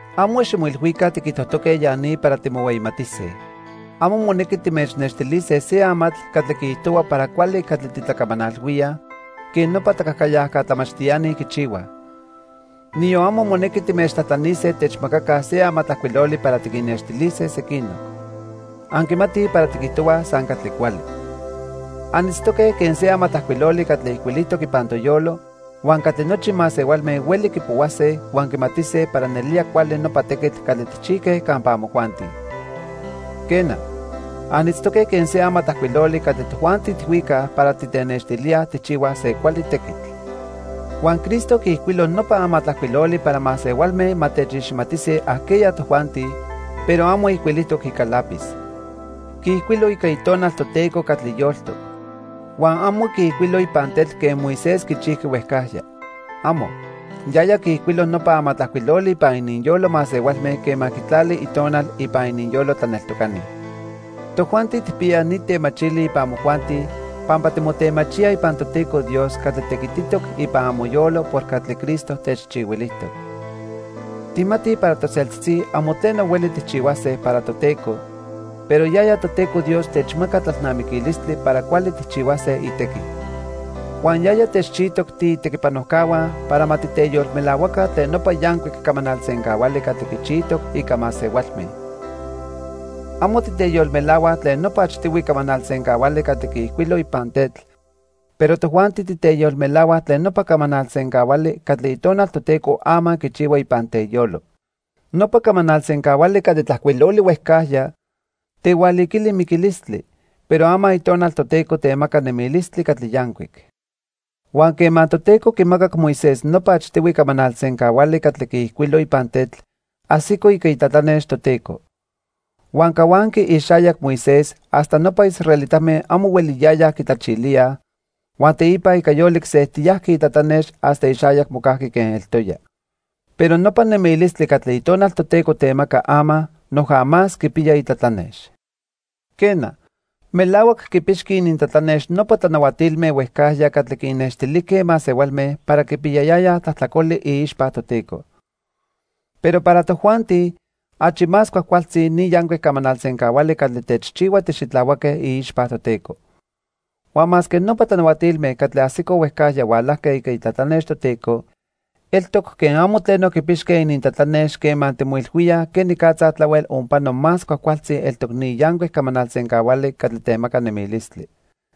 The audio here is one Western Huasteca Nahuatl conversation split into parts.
Amo ximoilhuica tiquijtojtoque ya ni para timohueyimatise. Amo monequi timechnextilise se amatl catli quiijtohua para cuali catli titlacamanalhuíaj quen nopa tlacajcayajca tlamachtiani quichihuaj. Niyon amo monequi timechtlajtlanise techmacaca se amatlajcuiloli para tiquinnextilise sequinoc. Anquimatij para tiquijtohuaj san catli cuali. Anitztoque quen se amatlajcuiloli catli ijcuilijtoc ipan toyolo huan catli nochi masehualme hueli quipohuase huan quimatise para nelía cuali nopa tequitl catli tijchijque campa amojuanti. Quena, anitztoque quen se amatlajcuiloli catli tojuanti tijhuicaj para titenextilíaj tijchihuaj se cuali tequitl. Huan Cristo quiijcuilo nopa amatlajcuiloli para masehualme ma techiximatise ajqueya tojuanti, pero amo ijcuilijtoc ica lápiz. Quiijcuilo ica Itonal Toteco catli yoltoc. Huan amo quiijcuilo ipan tetl quen Moisés quichijqui huejcajya. ¡Amo! Yaya quiijcuilo nopa amatlajcuiloli ipan ininyolo masehualme quema quitlali Itonal ipan ininyolo tlaneltocani. Tojuanti tijpiyaj ni temachili ipan amojuanti pampa timotemachíaj ipan Toteco Dios catli tequititoc ipan amoyolo por catli Cristo techchihuilijtoc. Tijmatij para toseltzitzi amo tleno hueli tijchihuase para Toteco, pero yaya Toteco Dios techmaca tlalnamiquilistli para cuali tijchihuase itequi. Huan yaya techchijtoc tiitequipanojcahua para ma titeyolmelahuaca tlen nopa yancuic camanal sencahuali catli quichijtoc ica masehualme. Amo titeyolmelahuaj tlen nopa achtihui camanal sencahuali catli quiijcuilo ipan tetl, pero tojuanti titeyolmelahuaj tlen nopa camanal sencahuali catli Itonal Toteco ama quichihua ipan teyolo. Nopa camanal sencahuali catli tlajcuiloli huejcajya tehualiquili miquilistli, pero ama Itonal Toteco temaca nemilistli catli yancuic. Huan quema Toteco quimacac Moisés nopa achtihui camanal sencahuali catli quiijcuilo ipan tetl, ajsico ica itlatlanex Toteco. Huan cahuanqui ixayac Moisés hasta nopa israelitame amo hueliyayaj quitlachilíaj, huan teipa ica yolic sejtiyajqui itlatlanex hasta ixayac mocajqui quen eltoya. Pero nopa nemilistli catli Itonal Toteco temaca ama noja más quipiya itlatlanex. Quena, melahuac quipixqui inintlatlanex nopa tlanahuatilme huejcajya catli quinnextilijque masehualme para quipiyayayaj tlajtlacoli iixpa Toteco. Pero para tojuanti achi más cuajcualtzi ni yancuic camanal sencahuali catli techchihua tixitlahuaque iixpa Toteco. Huan masque nopa tlanahuatilme catli ajsicoj huejcajya hualajque ica itlatlanex Toteco, eltoc quen amo tleno quipixque inintlatlanex quema timoilhuíaj quenicatza tlahuel onpano más cuajcualtzi eltoc ni yancuic camanal sencahuali catli temaca nemilistli.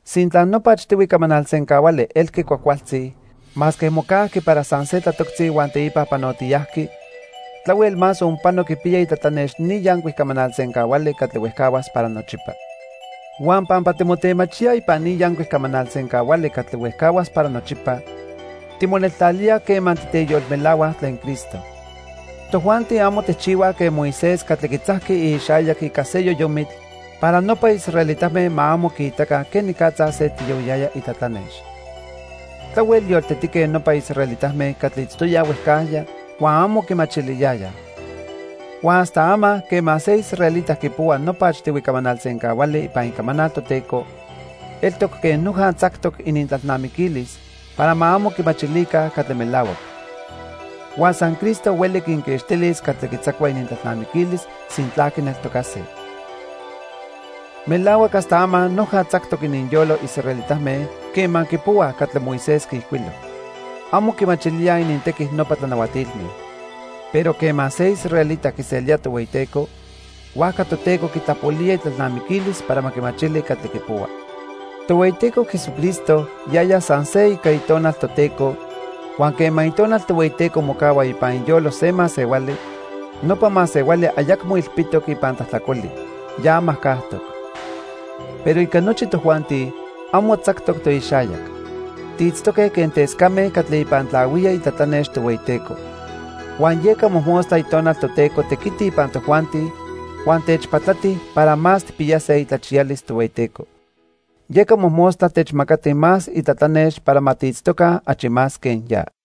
Sintla nopa achtihui camanal sencahuali elqui cuajcualtzi masque mocajqui para san se tlatoctzi huan teipa panotiyajqui, tlahuel más onpano quipiya itlatlanex ni yancuic camanal sencahuali catli huejcahuas para nochipa. Huan pampa timotemachíaj ipan ni yancuic camanal sencahuali catli huejcahuas para nochipa, timoneltlalíaj quema titeyolmelahuaj tlen Cristo. Tojuanti amo tijchihuaj quen Moisés catli quitzajqui ixayac ica se yoyomitl para nopa israelitame ma amo quiitaca quenicatza sejtiyohuiyaya itlatlanex. Tlahuel yoltetique nopa israelitame catli itztoyaj huejcajya huan amo quimachiliyayaj. Huan hasta ama quema se israelita quipohua nopa achtihui camanal sencahuali ipan Icamanal Toteco, eltoc quen noja tzactoc inintlalnamiquilis para ma amo quimachilica catli melahuac. Huan san Cristo hueli quinquixtilis catli quitzacua inintlalnamiquilis sintla quineltocase. Melahuac hasta ama noja tzactoc ininyolo israelitame quema quipohuaj catli Moisés quiijcuilo. Amo quimachilíaj inintequi nopa tlanahuatilme. Pero quema se israelita quiselía Tohueyiteco, huajca Toteco quitlapolía itlalnamiquilis para ma quimachili catli quipohua. Tohueyiteco Jesucristo yaya san se ica Itonal Toteco, huan quema Itonal Tohueyiteco mocahua ipan iyolo se masehuali, nopa masehuali ayacmo ilpitoc ipan tlajtlacoli, ya majcajtoc. Pero ica nochi tojuanti, amo tzactoc toixayac. Tiitztoque quen tescame catli ipan tlahuía itlatlanex Tohueyiteco. Huan yeca mojmostla Itonal Toteco tequiti ipan tojuanti huan techpatlati para más tijpiyase itlachiyalis Tohueyiteco. Yeca mojmostla techmacati más itlatlanex para ma tiitztoca achi más quen ya.